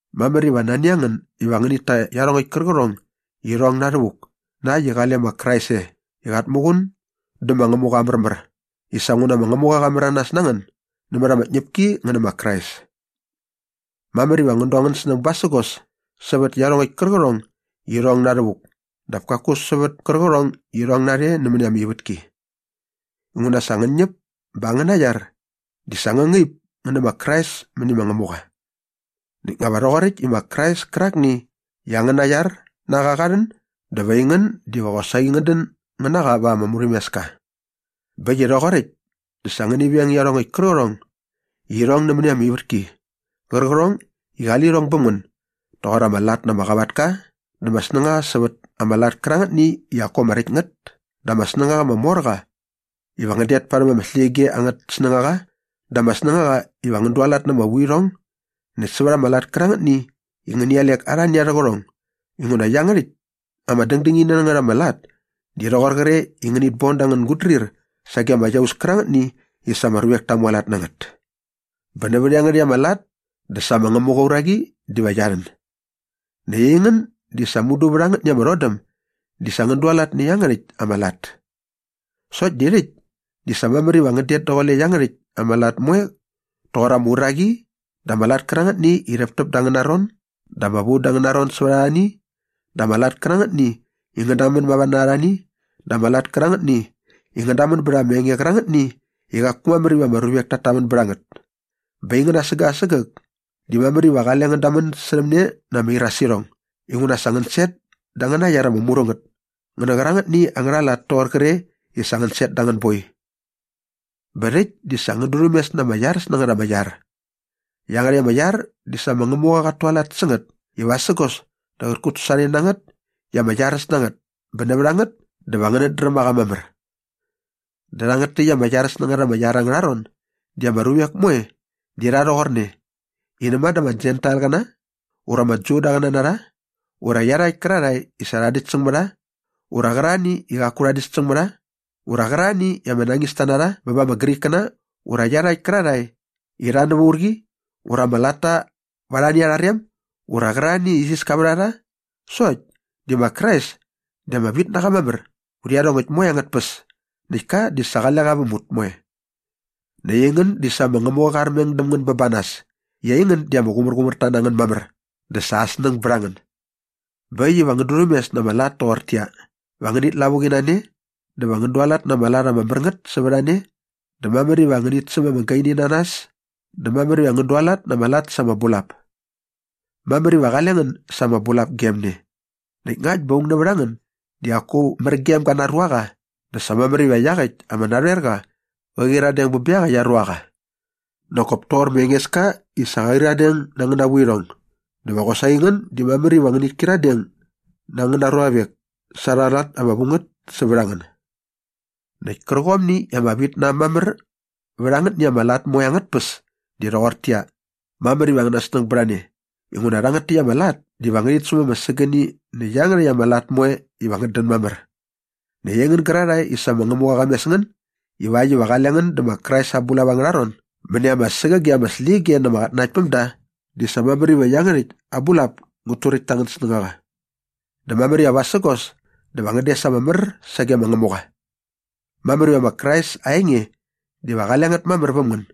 Mamär iva nani a ngän iva ngänit ta iarhongäkt kärqärhong i irhong na rhävuk na äkt i qale ma Krais e i qat muqun dä ma Ngämuqa aa märmär i sa nguna ma Ngämuqa qa märanas na ngän nämät ama tñäpki ngän nä ma Krais. Mamär iva ngän du angän snäng basägos sävät iarhongäkt kärqärhong i irhong na rhävuk dap kaku sävät kärqärhong i irhong narhe nämäni ama ivätki. Inguna sa ngän ñäp bä angäna iar di sa ngä ngaip ngä nä ma Krais mäni ma Ngämuqa. Näkt nga va rhoqoräkt i ma Krais kärakni i angäna iar na qa qa rhän dä va aingän diva qosaqi ngän dän ngän na qa va ama murhämeska. Bä äkt i rhoqoräkt dä sa ngäni veng iarhongäkt kärqärhong i irhong nämäni ama ivätki qärqärhong i qali lirhong bäm ngän doqor ama lat na ama qavatka dä ama snängaqa sävät ama lat kärangätni i qaku ama räkt ngät dä ama snängaqa ama mor qa iva ngän det parhäm ama släqyige angät snängaqa dä ama snängaqa iva ngän dualat na ama vuirhong näkt sävät ama lat kärangätni i ngäni alek arhani arhä qärhong inguna iangärhäkt ama dängdängini na ngät ama lat di rhoqor qre i ngänit bon da angän gutdrir sage ama iaus kärangätni i sa ama ruvek ta mualat na ngät. Bä nävät iangärhäkt ama lat dä sa ma Ngämuqa aa uraqi diva qia rhän. Näkt aingän di sa mudu vät angätni ama rhodäm di sa ngän dualat nä iangärhäkt ama lat. Sokt di rhäkt di sa mamär iva ngän det daqule iangärhäkt ama lat moe toqor ama uraqi dä ama lat kärangätni i rhäptäp dä angäna ron dä ama vu da angäna ron sävät arhani dä ama lat kärangätni i ngän dämän mava na arhani dä ama lat kärangätni i ngän dämän bät ama enge qärangätni i qaku mamär iva ama ruvek tat tamän bät a ngät. Bä aingän asägäk asägäk di mamär iva qale ngän damän särhäm ne na ama irasirhong inguna sa ngän set da angäna iar ama mru ngät ngä nä qärangätni angärha lat i rhoqor qre i sa ngän set da anga boi. Bä rhäkt di sa ngän durhämes na ama iaräs na ngät ama iar. Iangärhäkt ama iar di sa ma Ngämuqa qat tualat sä ngät i vasägos dä qät kutsasorhane na ngät i ama iaräs na ngät bä nävät a ngät dä va ngänät dräm a qa mamär. Dä rhangät täkt ama iaräs na ngät ama iar angärha ron di ama ruvek moe di rha rhoqorne i näma dä ama Jentailqäna ura ama Judaqäna na rha ura iarhakt kärarhae i sa rha däkt säng mä rha ura qärarhani i qaku rha däkt säng mä rha ura qärarhani i ama nañista na rha bä ba ama Grikkäna ura iarhakt kärarhae i rha nävä urqi ura ama latta va arhani arha rem ura qärarhani i isiska vät a rha sokt di ma Krais di ama vit na qa mamär vät iarhongäkt moe angät tpäs näkt ka di sa qale qa väm ut moe. Näkt aingän di sa ma Ngämuqa qa armeng däm ngän bä ba nas i aingän di ama qumärqumärta na ngän mamär dä sa aa snäng bät a ngän. Bä äkt iva ngän durhämes na ama lat toqortäqyia, va ngänit lavuqi na ne dä va ngän dualat na ama lat ama mär ngät sävät a ne dä mamär iva ngänit säm ama gaini na nas dä mamär iva ngän dualat na ama lat sa ama bulap. Mamär iva qale ngän sa ama bulap gem ne näkt ngakt bä aung nävät a ngän di qaku mär gem ga na aa ruaqa dä sa mamär iva iaqäkt ama narhoerqa qä qyiradeng bä bä iaqäkt aa ruaqa. Nak kop toqor ma Engeska i sa qa qyiradeng na angäna vuirhong dä va qosaqi ngän di mamär iva ngänit kyiradeng na angäna ruavek sa arha lat ama vu ngät sävät a ngän. Näkt kärqomni i ama vit na äm mamär vät angätni ama lat moe angät tpäs di rhoqortäqyia, mamär iva angäna snäng bät a ne inguna rhangät täkt ama lat diva ngärhit säm ama sägäni nä iangärhäkt ama lat moe iva ngät dän mamär. Näkt aingän gärarhae i sa ma Ngämuqa qa mes ngän ivakt iva qale ngän dä ma Krais aa bulap angärha ron mäni ama sägäge ama släqyige na ama qatnanaktpämda di sa mamär iva iangärhäkt aa bulap ngät turäkt ta angän snängaqa. Dä mamär iva vasägos dä va ngän des ama mär sage ma Ngämuqa. Mamär iva ma Krais aa enge diva qale ngät mamär väm ngän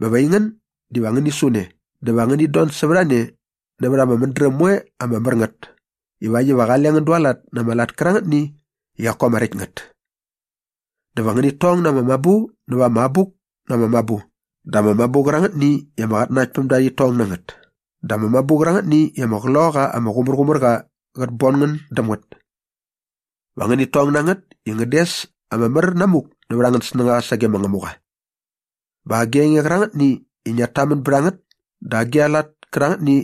bä va aingän diva ngäni su ne dä va ngänit don sävät a ne nävät ama mädräm moe ama mär ngät ivakt iva qale ngän dualat na ama lat kärangätni i qaku ama räkt ngät. Dä va ngänit tong na ama mabu näva ama Abuk na ama Mabu dä ama mabu qärangätni i ama qatnanaktpämda rhit tong na ngät dä ama mabu qärangätni i ama Qloqaqa ama Qumärqumärqa qät bon ngän däm ngät. Va ngänit tong na ngät i ngän des ama mär namuk nävät angän snängaqa sage ma Ngämuqa. Bä agi a enge qärangätni i ngiat tamän bät a ngät dä agi a lat kärangätni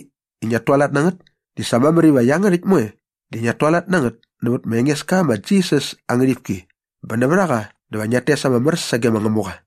i ngiat tualat na ngät di sa mamär iva iangärhäkt moe di ngiat tualat na ngät nävät ma Engeska ma Jisas aa ngärhipki bä nävät a qa dä va ngiat tes ama mär sage ma Ngämuqa.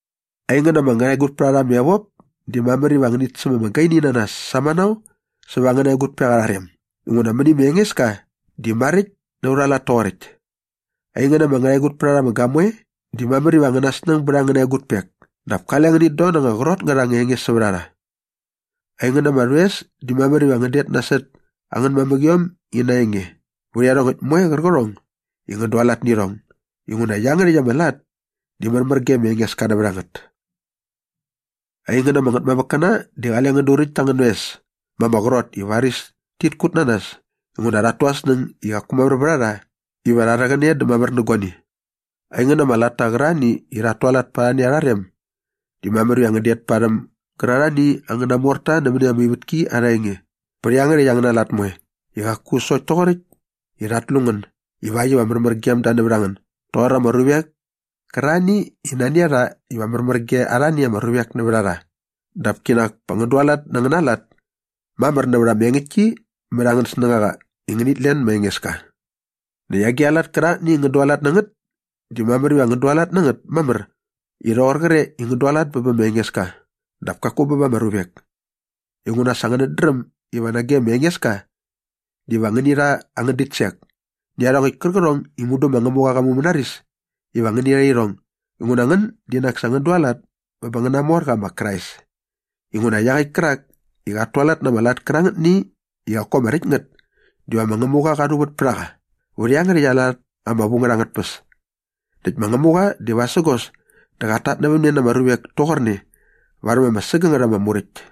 Aingän ama ngärhaegutpärharha ama evop di mamär iva ngänit säm ama gaini na nas samanao säva angäna egutpek arha rem inguna mäni ma Engeska di maräkt na aurha lat toqoräkt. Aingän ama ngärhaegutpärharha ama gamoe di mamär iva angäna snäng bät angäna egutpek dap kale ngänit don na anga qrot ngät anga enge sävät a rha. Aingän ama rhoes di mamär iva ngän det nasot angän mamäqiom ina enge vät iarhongäkt moe qärqärhong i ngän dualat nä irhong inguna iangärhäkt ama lat di märmär ge ma Engeska nävät a ngät. Aingän ama ngätmamäkkäna di qale ngän duräkt ta angän oes ma ama qrot i varis tit kut na nas inguna rhat tu arhä snäng i qaku mamär vät a rha iva rha rhäqäne dä mamär nä guani. Aingän ama latta qärarhani i rhat tualat pa arhani arha rem di mamär iva ngän det parhäm gärarhani angäna morta nämäni ama ivätki arha enge bät iangärhäkt angäna lat moe i qaku sokt toqoräkt i rhat lu ngän ivakt iva märmär gem da nävät a ngän doqor ama ruvek kärarhani i nani a rha iva märmär ge arhani ama ruvek nävät a rha dap kinak pa ngän dualat na angäna lat mamär nävät ama engäktki mät angän snängaqa i ngänit len ma Engeska. Näkt agi a lat kärangätni i ngän dualat na ngät di mamär iva ngän dualat na ngät mamär i rhoqor qre i ngän dualat bä bä ma Engeska dap kaku bä ba ama ruvek inguna sa ngänät dräm iva nage ma Engeska diva ngäni rha angän ditsek nä iarhongäkt kärqärhong i mudu ma Ngämuqa qa mumänaris iva ngäni rha irhong inguna ngän di nak sa ngän dualat bä ba angäna morqa ma Krais. Inguna iaqäkt kärak i qat tualat nä ama lat kärangätni i qaku ama räkt ngät diva ma Ngämuqa qa rhuvät pät a qa vät iangärhäkt aa lat ama vu ngät angät tpäs. Näkt ma Ngämuqa di vasägos dä qat tatnävämne na ama ruvek toqorne varhäm ama sägängät ama muräkt.